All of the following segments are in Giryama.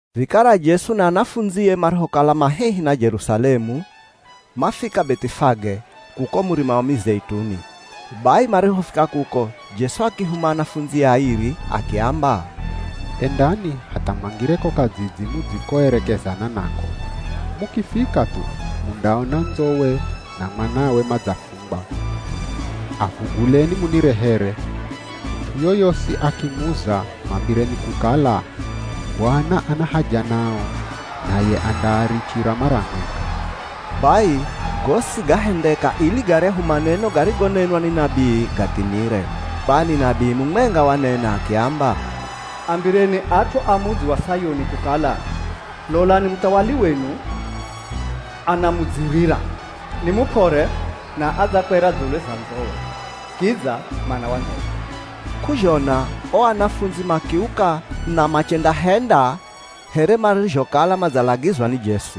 Vikara Jesu na anafundzie marihokala ma hehi na Jerusalemu, mafika Beth'ifage, kuko Murima wa Mizeituni. Bai marihofika kuko, Jesu akihuma anafundzie airi akiamba, “Endani hatha mwangire ko kadzidzi mudzikoerekezana nako. Mukifika thu mundaona ndzowe na mwanawe madzafungwa. Avuguleni munirehere. Mut'u yoyosi akimuza mwambireni kukala, ‘Bwana ana haja nao.’ Naye andaarichira mara mwenga.” Bai gosi gahendeka ili garyahu maneno garigonenwa ni nabii gathimire. Kwani nabii mumwenga wanena akiamba, “Ambireni at'u a mudzi wa Sayuni kukala, ‘Lolani, muthawali wenu anamudzirira. Ni mup'ore na adzakwera dzulu za ndzowe, kidza mwana wa ndzowe.’” K'uzhona o anafundzi makiuka na machendahenda here marizhokala madzalagizwa ni Jesu.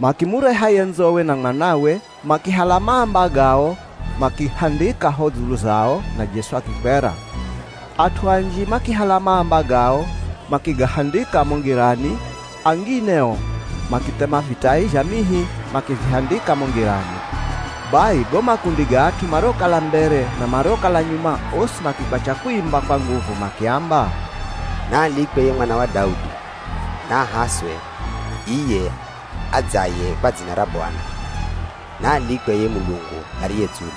Makimureha ye ndzowe na mwanawe, makihala maamba gao makihandika ho dzulu zao na Jesu akikwera. At'u anji makihala maamba gao makigahandika mo ngirani, angine o makithema vitai zha mihi makivihandika mo ngirani. Bai go makundi ga at'u mariokala mbere na mariokala nyuma osi makikwacha kuimba kwa nguvu makiamba, “Naalikwe ye mwana wa Daudi! Naahaswe iye adzaye kwa dzina ra Bwana! Naalikwe ye Mulungu ariye dzulu!”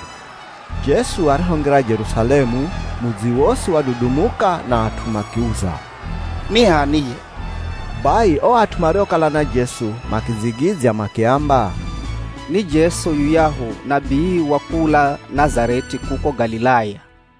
Jesu arihongira Jerusalemu, mudzi wosi wadudumuka na at'u makiuza, “Ni h'ani ye?” Bai o at'u mariokala na Jesu makidzigidzya makiamba, “Ni Jesu, yuyahu nabii wa kula Nazareth'i kuko Galilaya.”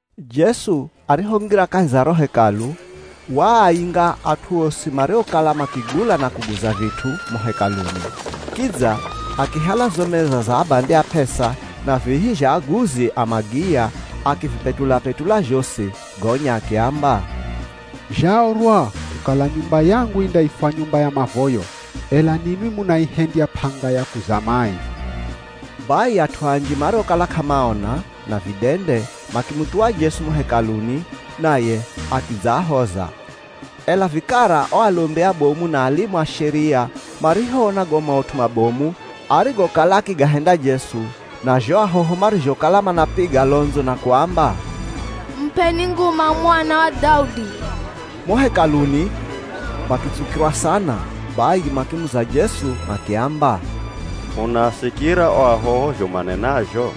Jesu arihongira kahi za ro Hekalu, waainga at'u osi mariokala makigula na kuguza vit'u mo Hekaluni. Kidza akihala zo meza za abandi a p'esa, na vihi zha aguzi a magiya, akivipetula-petula zhosi. Gonya akiamba, “Zhaorwa kukala, ‘Nyumba yangu indaifwa nyumba ya mavoyo,’ ela ninwi munaihendya p'anga ya kuzama aivi.” Bai at'u anji mariokala k'amaona, na vidende makimuthuwa Jesu mo Hekaluni, naye akidzaahoza. Ela vikara o alombi abomu na alimu a Sheria marihoona go maut'u mabomu arigokala akigahenda Jesu, na zho ahoho marizhokala manapiga londzo na kuamba, “Mup'eni nguma Mwana wa Daudi!” mo Hekaluni makitsukirwa sana. Bai makimuza Jesu makiamba, “Unaasikira o ahoho zho manenazho?”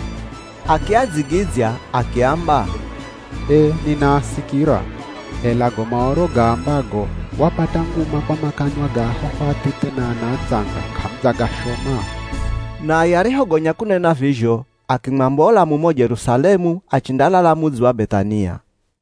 Akiadzigidzya akiamba, “Ee ninaasikira. Ela go Maoro gaambago, ‘Wapata nguma kwa makanwa ga ahoho athithe na ana atsanga’ k'amudzagashoma?” Naye arihogonya kunena vizho akimwambola mumo Jerusalemu achendalala mudzi wa Beth'ania.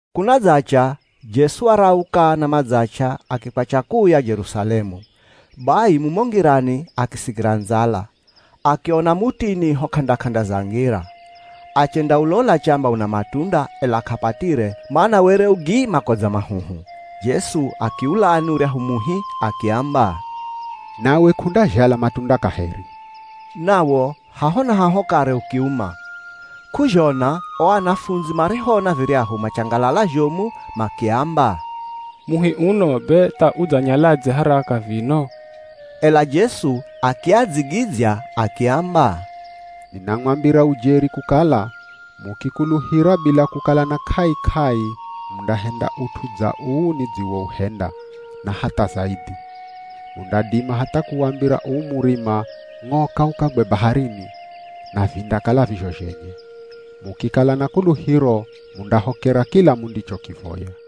Kunadzacha, Jesu warauka na madzach'a akikwacha kuuya Jerusalemu. Bai mumo ngirani akisikira ndzala. Akiona mutini ho k'anda-k'anda za ngira. Achendaulola chamba una matunda, ela k'apatire, mana were u gi makodza mahuhu. Jesu akiulani uryahu muhi akiamba, “Nawe k'undazhala matunda kaheri.” Nawo haho na haho kare ukiuma. K'uzhona o anafundzi marihoona viryahu machangalala zhomu, makiamba, “Muhi uno be tha udzanyaladze haraka vino?” Ela Jesu akiadzigidzya akiamba, “Ninamwambira ujeri kukala, mukikuluhira bila kukala na k'ai-k'ai mundahenda ut'u dza uu nidziwouhenda, na hatha zaidhi. Mundadima hatha kuwambira uu murima, ‘Ng'oka ukagwe baharini.’ Na vindakala vizho zhenye. Mukikala na kuluhiro mundahokera kila mundichokivoya.”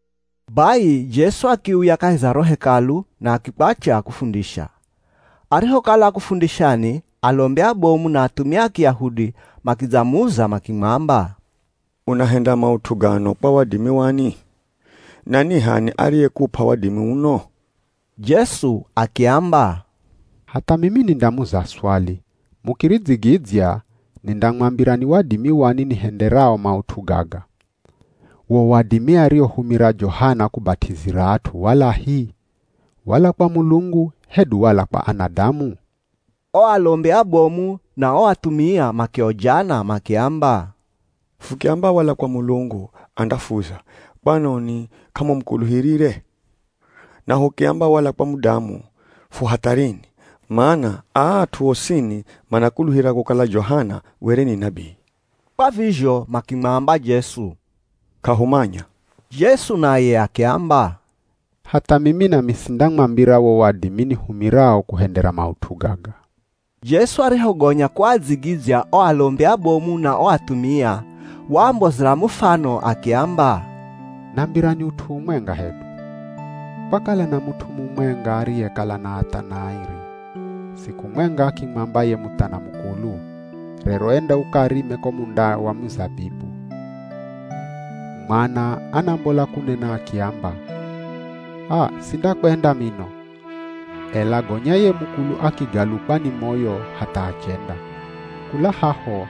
Bai Jesu akiuya kahi za ro Hekalu na akikwatya kufundisha. Arihokala akufundishani, alombi abomu na athumia a Kiyahudi makidzamuza makimwamba, “Unahenda maut'u gano kwa wadimi wani? Na ni h'ani ariyekup'a wadimi uno?” Jesu akiamba, “Hatha mimi nindamuza swali, mukiridzigidzya, nindamwambira ni wadimi wani nihenderao maut'u gaga. Wo wadimi ariohumira Johana kubat'izira at'u walahi? Wala kwa Mulungu hedu wala kwa anadamu?” O alombi abomu na o athumia makiojana makiamba, “Fukiamba wala kwa Mulungu, andafuza, ‘Kwanoni k'amumukuluhirire?’ Na hukiamba, ‘Wala kwa mudamu,’ fu hatharini, mana aa at'u osini manakuluhira kukala Johana were ni nabii.” Kwa vizho makimwamba Jesu, “K'ahumanya.” Jesu naye akiamba, “Hatha mimi nami sindamwambira wo wadimi nihumirao kuhendera maut'u gaga.” Jesu arihogonya kuadzigidzya o alombi abomu na o athumia, waambozera mufano akiamba, “Nambirani ut'u umwenga hedu. Kwakala na mut'u mumwenga ariyekala na athana airi. Siku mwenga akimwamba ye muthana mukulu, ‘Rero enda ukarime ko munda wa mizabibu.’ Mwana anambola kunena akiamba, ‘Aa sindakwenda mino.’ Ela gonya ye mukulu akigalukwa ni moyo hatha achenda. Kula haho,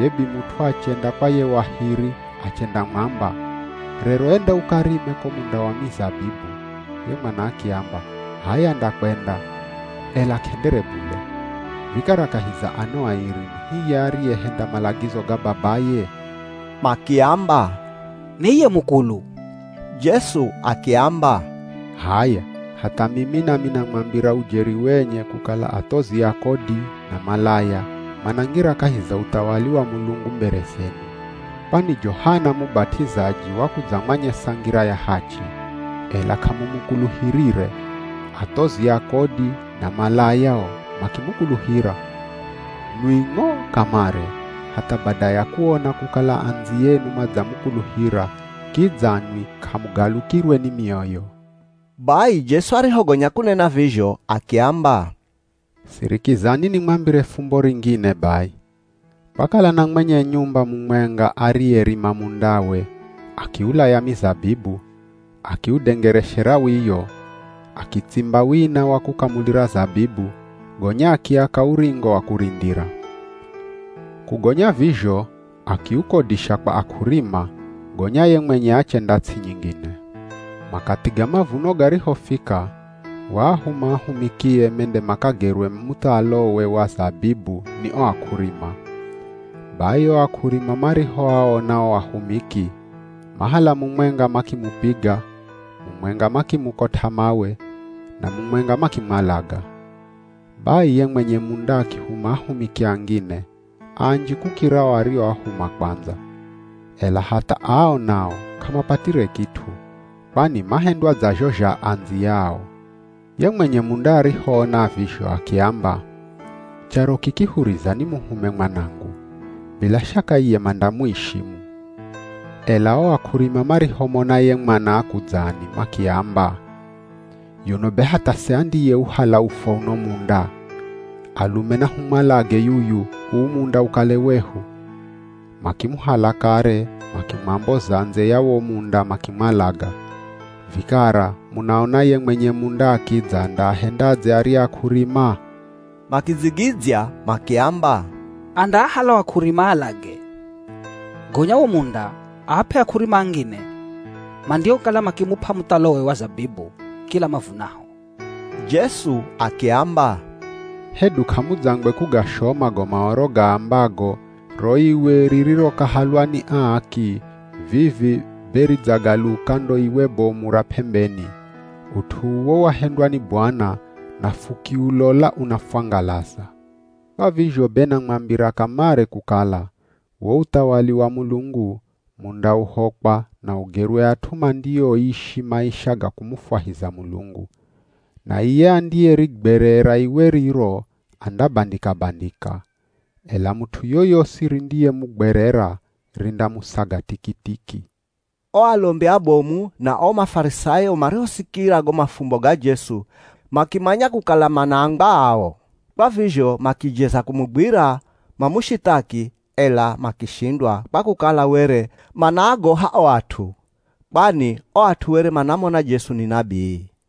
ye bimut'u achenda kwa ye wa hiri achendamwamba, ‘Rero enda ukarime ko munda wa mizabibu.’ Ye mwana akiamba, ‘H'aya ndakwenda.’ Ela k'endere bule. Vikara kahi za ano airi ni hiye ariyehenda malagizo ga babaye?” Makiamba, “Ni iye mukulu.” Jesu akiamba, “H'aya, hatha mimi nami namwambira ujeri wenye kukala athozi a kodi na malaya manangira kahi za uthawali wa Mulungu mbere zenu. Kwani Johana Mubat'izaji wakudzamwanyesa ngira ya hachi, ela k'amumukuluhirire, athozi a kodi na malaya o makimukuluhira. Nwi ng'o kamare, hatha bada ya kuona kukala andziyenu madzamukuluhira kidza nwi k'amugalukirwe ni mioyo.” Bai Jesu arihogonya kunena vizho akiamba, “Sirikizani nimwambire fumbo ringine bai. Kwakala na mwenye nyumba mumwenga ariyerima mundawe akiulaya mizabibu, akiudengereshera wiyo, akitsimba wina wa kukamulira zabibu, gonya akiaka uringo wa kurindira. Kugonya vizho, akiukodisha kwa ak'urima, gonya ye mwenye achenda ts'i nyingine. Makathi ga mavuno garihofika, waahuma ahumikie mende makagerwe muthalowe wa zabibu ni o ak'urima. Bai o ak'urima marihoaona o ahumiki, mahala mumwenga makimupiga, mumwenga makimukot'a mawe, na mumwenga makimwalaga. Bai, ye mwenye munda akihuma ahumiki angine, anji kukira o arioahuma kwandza. Ela hatha ao nao k'amapatire kit'u, kwani mahendwa dza zho zha andziyao. Ye mwenye munda arihoona vizho akiamba, ‘Charo kiki huriza nimuhume mwanangu. Bila shaka iye mandamuishimu.’ Ela o ak'urima marihomona ye mwana akudzani, makiamba, ‘Yuno be hatha se andiyeuhala ufwa uno munda? Alume nahumwalage yuyu, uu munda ukale wehu.’ Makimuhala kare makimwamboza ndze ya wo munda makimwalaga. Vikara, munaona ye mwenye munda akidza andaahendadze arya ak'urima?” Makidzigidzya makiamba, “Andaahala o ak'urima aalage, gonya wo munda aap'e ak'urima angine mandiokala makimup'a muthalowe wa zabibu kila mavunaho.” Jesu akiamba, “Hedu k'amudzangwe kugashoma go Maoro gaambago, ‘Ro iwe ririrokahalwa ni aaki vivi be ridzagaluka ndo iwe bomu ra p'embeni. Ut'u uwo wahendwa ni Bwana, Na fukiulola unafwangalaza?’ Kwa vizho be namwambira kamare kukala, wo uthawali wa Mulungu mundauhokwa na ugerwe at'u mandioishi maisha ga kumufwahiza Mulungu. Na iye andiyerigwerera iwe riro andabandika-bandika. Ela mut'u yoyosi rindiyemugwerera, rindamusaga tikitiki.” O alombi abomu na o Mafarisayo marihosikira go mafumbo ga Jesu, makimanya kukala manaambwa ao. Kwa vizho makijeza kumugwira mamushithaki, ela makishindwa kwa kukala were manaagoha o at'u. Kwani o at'u were manamona Jesu ni nabii.